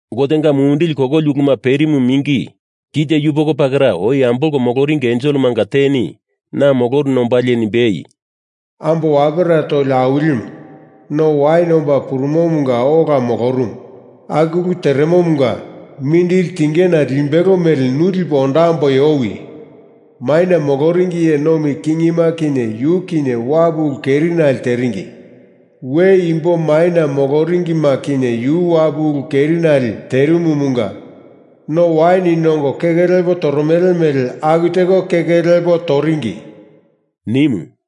Gotenga mumindili kololi uluma perimu mingi kite yupoko pakera oi ambolko moloringi enselemanga teni na moloruna ombalie nimbei, “Ambo wapera toli awilimu, no awini omba purumomanga ola moromomu, aku ulu teremomunga mindili tingena limbelo mele nu lipo ondamboi owi! Maina moloringi iye nomi kingima kinye yu kinye wapu ulu kerinale teringi, we imbo maina moloringima kinye yu wapu ulu kerinale terimumunga no wain nongo keke lepo toromele mele aku teko keke lepo toringi,” nimu.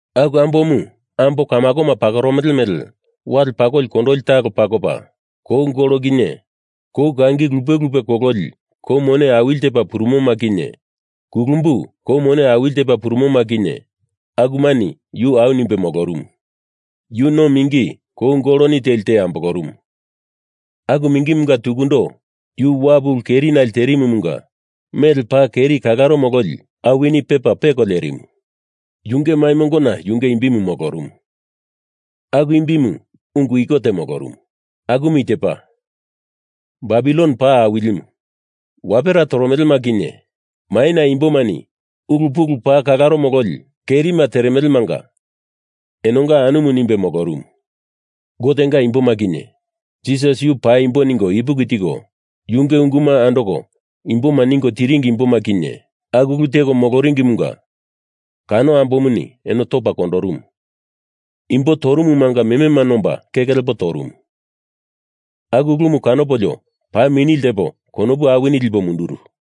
Aku ambomu ambo kamakoma pakoromele mele wale pakoli kondoli talo pakopa, kou gol kinye kou kangi lupe lupe kololi kou mone awili tepa purumoma kinye kulumbu kou mone awili tepa purumoma kinye akumani yu au nimbe molorumu. Yu no mingi kou goloni teli te ambolorumu, aku mingimunga tukundo yu wapu ulu kerinale terimumunga mele paa keri kalaro mololi awini pepa peko lerimu. Yunge mai mongona yunge imbi molorumu, aku imbimu ungu iko te molorumu, akumu i tepa, Babilon Paa Awilimu, Wapera Toromelema Kinye Maina Imbomani Ulu Pulu Paa Kalaro Mololi Kerima Teremelemanga Enonga Anumu, nimbe molorumu. Gotenga imboma kinye, Jisas Yu paimbo ningo ipuki tiko yunge unguma andoko imboma ningo tiringi imboma kinye, aku ulu teko moloringimunga kano ambomuni eno topa kondorumu. Imbo torumumanga memema nomba, keke lepo torumu. Aku ulumu kanopolio paa mini ltepo konopu awini lipo munduru.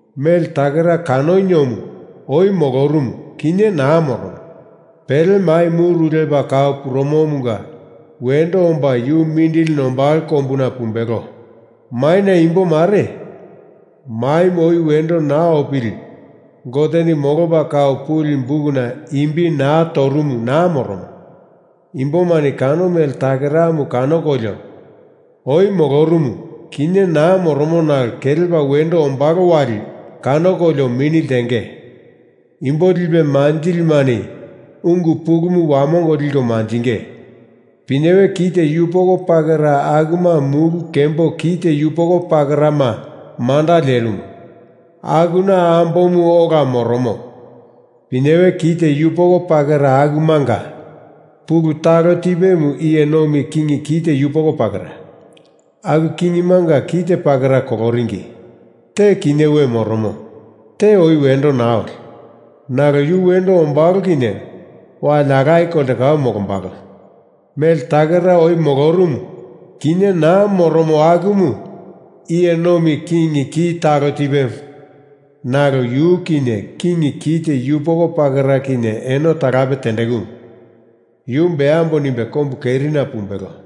Mele takera kanoniomu oi molorumu, kinye naa moromo, pele mai muru lepa kau purumomunga wendo omba yu mindili nombalo kombuna pumbelo. Maina imbo mare, maimu oi wendo naa opili Goteni molopa kau puli bukuna imbi naa torumu naa moromo imbomani kano mele takeramu kanokolio, oi molorumu, kinye naa moromo nalo kelepa wendo ombalo wali kanokolio mini ltenge. Imbo lipe manjilimani ungu pulumu wamongo liko manjinge. Pinyewe kite yupoko pakera akuma mulu kembo kite yupoko pakerama manda lerimu. Akuna ambomu ola moromo. Pinyewe kite yupoko pakera akumanga pulu talo tipemu iye nomi king kite yupoko pakera. Aku kingimanga kite pakera koloringi, te kinye we moromo, te oi wendo naa oli. Nalo yu wendo ombalo kinye wali alaye kolte kau molombalo. Mele takera oi molorumu, kinye naa moromo akumu iye nomi king ki talo tipemu. Nalo yu kinye king kite yupoko pakera kinye eno talape tendekumu. Yu beambo nimbe kombu kerina pumbelo.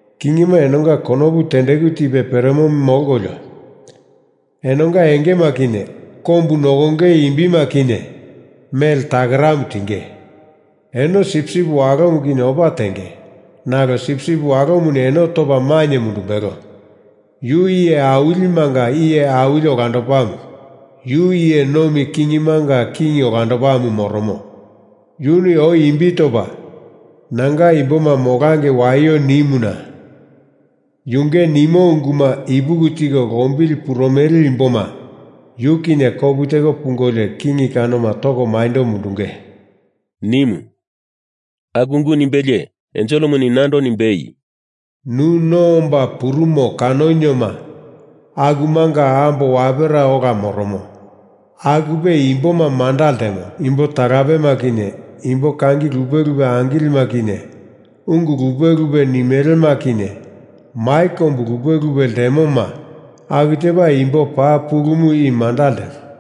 Kingima enonga konopu tendeku tipe peremo molkolio, enonga engema kinye kombu nokongei imbima kinye mele takeramu tinge. Eno Sipsip Walomu kinye opa tenge, nalo Sipsip Walomuni eno topa mainye mundumbelo. Yu iye awilimanga iye awili olandopamu, yu iye nomi kingimanga king olandopamu moromo. Yuni oi imbi topa Nanga imboma molangei waio nimuna yunge nimo unguma ipuki tiko lombili purumele imboma yu kinye kopu teko pungolio king kanoma toko maindo mundunge,” nimu. Aku ungu nimbelie enselemuni nando nimbei, “Nu no omba purumo kanonioma, akumanga ambo wapera ola moromo, akupe imboma manda ltemo. Imbo talapema kinye imbo kangi lupe lupe angilima kinye ungu lupe lupe nimelema kinye mai kombu lupe lupe ltemoma aku tepa imbo paa pulumu i manda ltemo.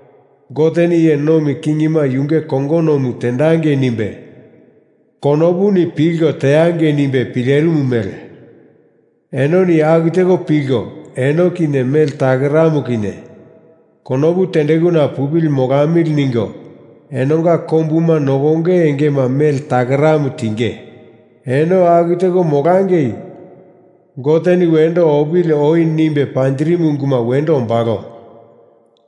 Goteni iye nomi kingima yunge kongonomu tendangei nimbe konopuni pilko teangei nimbe pilerimu mele enoni aku teko pilko eno kinye mele takeramu kinye konopu tendekuna pupili molamili ningo enonga kombuma nokonge engema mele takeramu tinge. Eno aku teko molangei Goteni wendo opili oi nimbe panjirimu unguma wendo ombalo.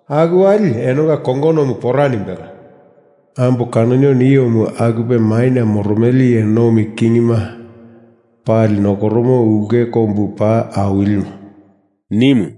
Aku wali enonga kongonomu pora nimbelo. Ambo kanoniomu akupe maina moromele iye nomi kingima pali nokoromo ulke kombu paa awilimu,” nimu.